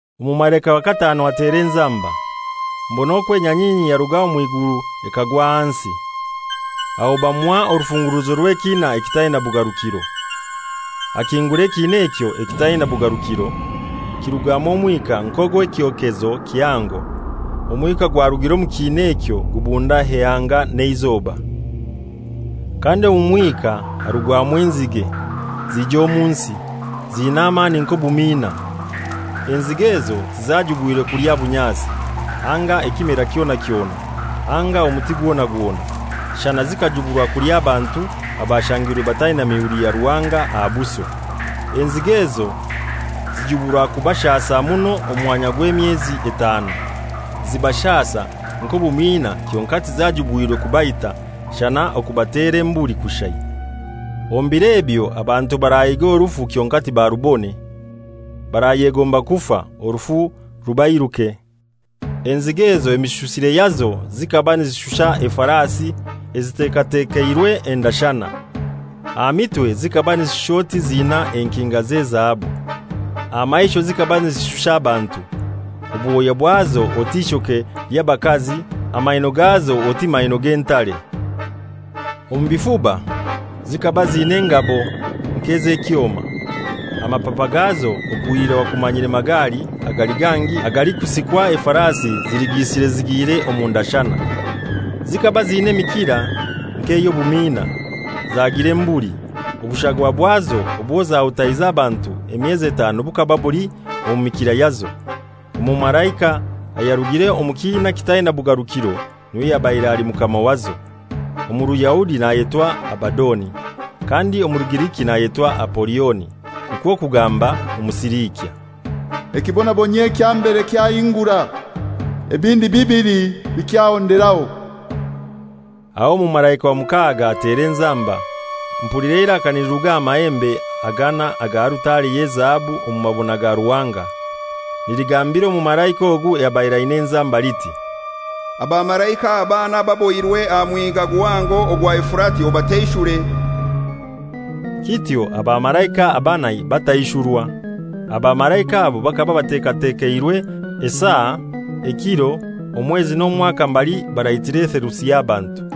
Omumalaika wa katanu atera enzamba. Mbona okwo enyanyinyi yaruga omw'iguru ekagwa ahansi. Aho bamuha orufunguruzo rw'ekina ekitaina bugarukiro. Akingura ekiina ekyo ekitaina bugarukiro, kirugwamu omwika nk'ogw'ekyokezo kihango. Omwika gwarugire omu kiina ekyo gubunda eanga n'eizoba. Kandi omu mwika harugwamu enzige, zija omu nsi, ziina amani nk'obumiina. Enzige ezo tizajubwirwe kulya bunyasi, anga ekimera kyona kyona, anga omuti gwona gwona, shana zikajuburwa kulya abantu abashangirwe bataina mihuri ya Ruhanga aha buso. Enzige ezo zijuburwa kubashasa muno omwanya gw'emyezi etanu. Zibashasa nk'obumiina kyonkai tizajubwirwe kubaita, shana okubatera embuli kushai. Omu biro ebyo abantu barahiiga orufu kyonkai tibarubone. Barayegomba kufa, orufu rubairuke. Enzige ezo emishusire yazo zikaba nizishusha efarasi ezitekatekeirwe endashana. Aha mitwe zikaba nizishusha oti ziinaho enkinga z'ezahabu. Aha maisho zikaba nizishusha abantu. Obwoya bwazo oti ishoke ly'abakazi, amaino gazo oti maino g'entare. Omu bifuba zikaba ziina engabo nk'ez'ekyoma, amapapa gazo okuhilira wakumanyire magali agali gangi agalikusikwa efarasi ziligisire zigiire omu ndashana. Zikaba ziina emikira nk'ey'obumiina, zagira embuli, obushagwa bwazo obwo zahutaize abantu emyezi etanu bukaba buli omu mikira yazo. Omumalaika ayarugire omu kiina kitaina bugarukiro n'iwe yabaire ali mukama wazo. Omu Ruyahudi nayetwa Abadoni, kandi omu Rugiriki nayetwa Apolioni: Nikwo kugamba: Omusiliikya. Ekibonabonyio ekya mbere kyahingura. Ebindi bibili bikyahonderaho. Aho omumalaika wa mukaaga atera enzamba. Mpulira eiraka niliruga aha mahembe agana aga alutare y'ezahabu omu mabona ga Ruhanga, niligambira omumalaika ogu ayabaire aina enzamba liti, «Abamalaika abana ababohirwe aha Mwiga Guhango ogwa Efurati obataishure.» Kityo abamalaika abanai bataishurwa. Abamalaika abo bakaba batekatekeirwe esaa, ekiro, omwezi n'omwaka mbali baraitira etheluti y'abantu.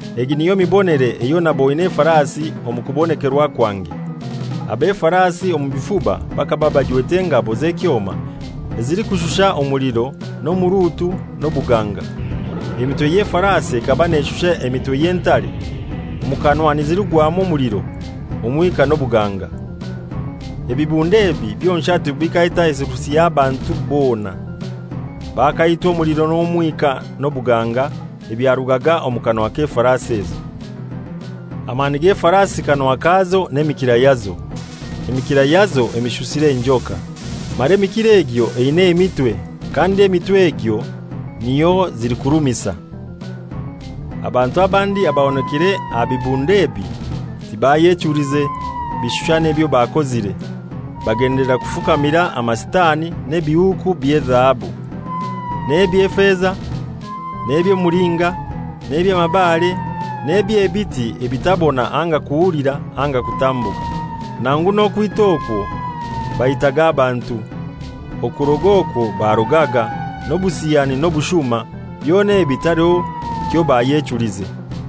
Egi niyo mibonere eyo naboine efarasi omu kubonekerwa kwange. Ab'efarasi omu bifuba bakaba bajwete engabo z'ekyoma ezilikushusha omuliro n'omurutu n'obuganga. Emitwe y'efarasi ekaba neshusha emitwe y'entare, omukanwa nizirugwamu omuliro, omwika n'obuganga. Ebibundo ebi byonshatu bikaita etheluti y'abantu bona. Bakaitwa omuliro n'omwika n'obuganga ebyarugaga omu kanwa k'efarasi ezo. Amani g'efarasi kanwa kazo n'emikira yazo. Emikira yazo emishusire njoka, mara emikira egyo eina emitwe, kandi emitwe egyo niyo zilikurumisa. Abantu abandi abahonokire aha bibundo ebi tibayechulize bishushani ebyo bakozire. Bagendelera kufukamira amasitani n'ebihuuku by'ezahabu, n'eby'efeza, n'eby'omulinga, n'eby'amabare, n'eby'ebiti ebitabona anga kuhulira anga kutambuka. Nangu n'okwita okwo baitaga abantu, okuroga okwo barogaga, n'obusiyani n'obushuma, byona ebi taliho kyobayechulize.